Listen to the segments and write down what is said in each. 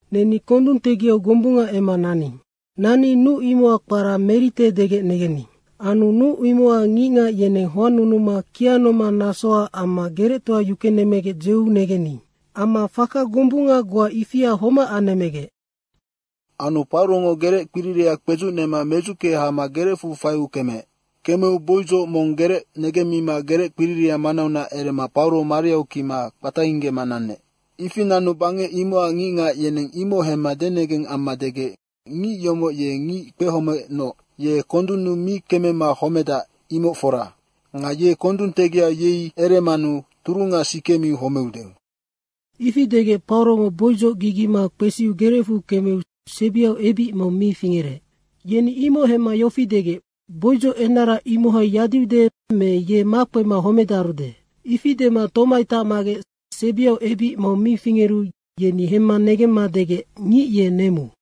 Neni kondung tegiau gombunga emma naning. Nanni nuc imoc kpara Merite degec negening. Anu nuc imocac ngicngac yeneng hoannunuma kianomang nasoac amma gerectoa yukenemmegec dzeu negening. Amma faka gombunga goa ifia homac anemmegec. Anu Paurongo gerec kpiriria kpedzucnema medzucke hama gerecfu faiu kemeec. Kemeu boudzoc mong gerec negemmima gereckpiriria manaunac erema Pauro mariau kima kpataingge nanec. Ifi nanu bangec imocac ngicngac yeneng imoc hemma denegeng amma degec, “Ngic imoc ye ngic kpehomeecnoc, ye kondunnu mi kemema homedac, imoc fora. Nga ye kondung tegiau yei eremanu turunga sikemiu homeude.” Ifi degec Paurongo boudzoc gigima kpesiu gerecfu kemeu sebiau ebic mong mi fingerec. Yeni imoc hemma yofi degec “Boudzoc enara imohai yadiude me ye makpema homedarude.” ifi dema tomai tacmagec sebiau ebic mong mi fingeru yeni hemma negemma degec, “Ngic ye nemu.”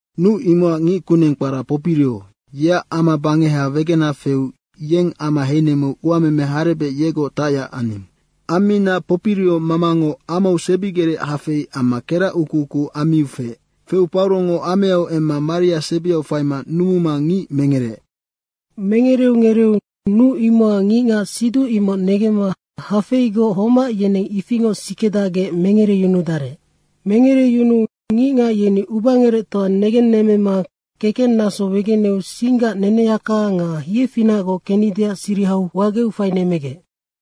Nuc imocac ngickuneng kpara Popirio, yeac ama bangeha wegenac feu yeng ama heinemmeu uameme harebec yegoc tacyac aning. Ammina Popirio mamango amau sebigerec hafei amma kerac ukuuku ammiu feec. Feu Paurongo ameau emma maria sebiau faima numuma ngic mengereec. Mengereu ngereeu nuc imocac ngicngac siduc imoc negemma hafeigoc homac yeneng ifingoc sikedacgec mengereyunudarec. Mengereyunuu ngicngac yeni ubangerectoa negennemmema kekennaso wegeneu singgac neneyaka nga hiefinacgoc kennideac sirihau wageu fainemmegec.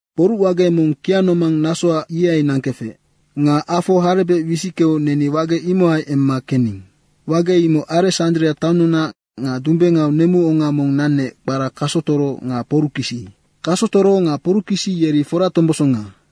Kporucwage mong kianomang nasoac ihai nangkefec. Nga afo harebec wisickeu neni wage imohai emma kening. Wage imoc Aresandria taonnunac nga dumbengau nemuonga mong nanec, kpara Kasotoro nga Porukisi. Kasotoro nga Porukisi yeri foratombosonga.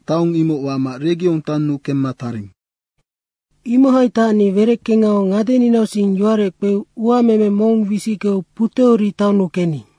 taong imoc wama Regiong taonnu kemma taring. Imohai tacni wereckengau ngadeninausing yowarec kpeu uameme mong wisickeu Puteori taonnu kening.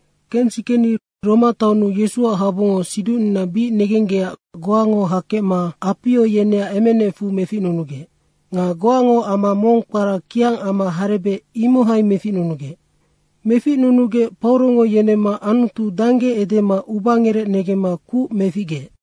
Kensikeni Roma taonnu Yesuac habungo siducnina bic negenggecac goango hakecma Apio yeneac emenecfu meficnunugec. Nga goango ama mong kpara Kiang ama harebec, imohai meficnunugec. Meficnunugec Paurongo yenemma Anutu dangge edema ubangerec negemma kuc meficgeec.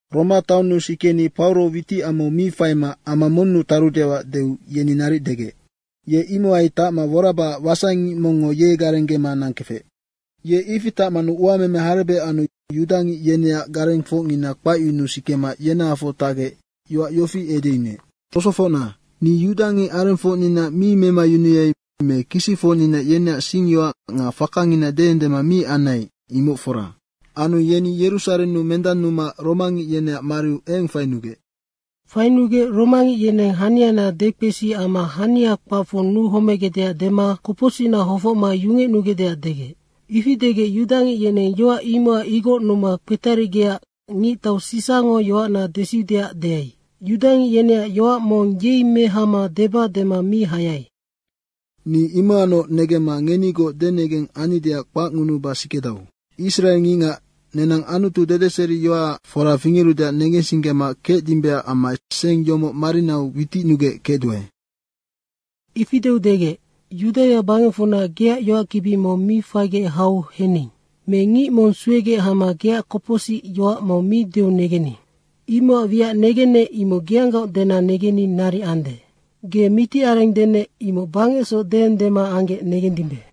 Roma taonnu sikeni Pauro witicamau mi faima ama monnu tarudeac deu yeni naric degec. Ye imohai tacma worabacac wasaingic mongngo ye garenggema kefec. Ye ifi tacmanu uameme harebec anu yudangic yeneac garengfocngina kpacyunuu sikema yenahafoc tacgec yoac yofi edeyunuec, “Tosofocna, ni yudangic arengfocnina mi memayunuai me kisicfocnina yeneac singyoac nga fakangina deendema mi anai, imoc fora. Anu yeni Yerusarennu mendannuma romangic yeneac mariu eng fainugec. Fainugec romangic yeneng haniana dekpesi amma hania kpacfu nuhomegecdeac dema kopocsicna hofocma yungecnugecdeac degec. Ifi degec yudangic yeneng yoac imocac igocnuma kpetarigecac ngictau Sisango yoacna desiudeac deai. Yudangic yeneac yoac mong yei mehama deba dema mi hayai. Ni imocacnoc negemma ngenigoc denegeng annideac kpacngunuba sikedau. Israengicngac nenang Anutu dedeseriyaac fora fingerudeac negensinggema kecdimbeac amma seng yomoc marinau witicnugec kecduae.” Ifi deu degec, “Yudaia bangecfunac geac yoackibi mong mi faigec hau hening. Me ngic mong suegec hama geac kopocsic yoac mong mi deu negening. Imocac wiac negennec, imoc geanggaoc dena negenni naric ande. Ge mitiareng denec, imoc bangecsoc deendema anggec negendimbe.”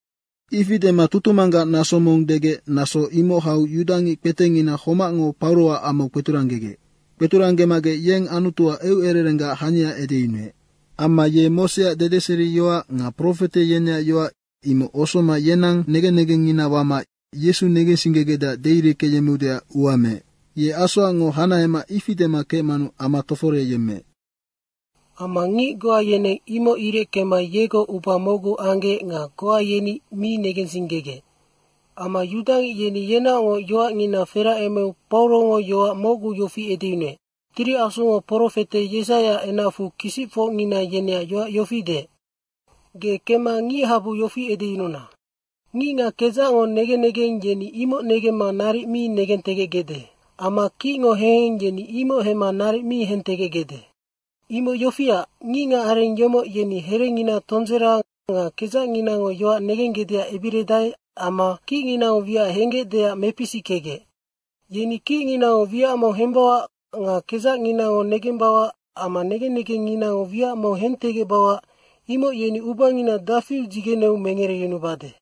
Ifi dema tutumanggac naso mong degec naso imoc hau yudangic kpetengina homacngo Pauroac amau kpeturanggegec. Kpeturanggemagec, yeng Anutuac eucererenggac hania edeyunuec. Amma ye Moseac dedeseriyoac nga profete yeneac yoac, imoc osoma yenang negen negengngina wama Yesu negensinggegecdeac deireckeyemmeudeac ua meec. Ye asoacngoc hanahema ifi dema kecmanu ama toforeyemmeec. Amma ngic goa yeneng imoc ireckema yegoc uba mocgu anggec nga goa yeni mi negensinggegec. Amma yudangic yeni yenaocngoc yoacngina feracemeu Paurongo yoac mocgu yofi edeyunuec, “Tiri Asungo profete Yesaiaac enacfu kisicfocngina yeneac yoac yofi deec, ‘Ge kemma ngichabu yofi edeyununa: Ngicngac kedzacngo negen negeng, yeni imoc negemma naric mi negentegecgecde. Amma kicngo heheng yeni imoc hemma naric mi hentegecgecde. Imoc yofiac, ngicngacareng yomoc yeni herengina tondzera nga kedzacnginango yoac negenggecdeac ebiridae amma kicnginango wiac henggecdeac mepisickegec. Yeni kicnginango wiac mong hembauac nga kedzacnginango negembauac amma negen negengnginango wiac mong negentegecbauac, imoc yeni ubangina dafiu dzigeneu mengereyunubade.’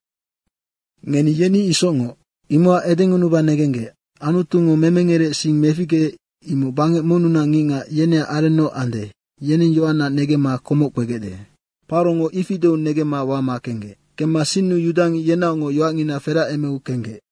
Ngeni yeni isocngoc. Imocac edengunuba negenggec, Anutungo memengerec sing meficgeec, imoc bangec monnunac ngicngac, yeneac arennoc ande, yeneng yoacna negemma komoc kpegecde.” Paurongo ifi deu negemma wama kenggec. [Kemma sinnu yudangic yenaocngoc yoacngina feracemeu kenggec.]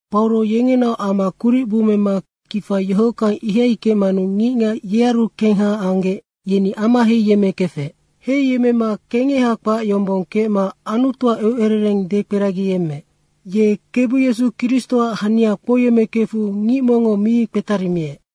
Pauro yengenaoc ama kuric bummema kifa yohockang ihai kecmanu ngicngac yearu kengha anggec, yeni ama heiyemmekefec. Heiyemmema kengeha kpac yombong kecma Anutuac eucerereng dekperagiyemmeec. Ye Kebu Yesu Kristoac hania kpouyemmekefu ngic mongngo mi kpetarimiec.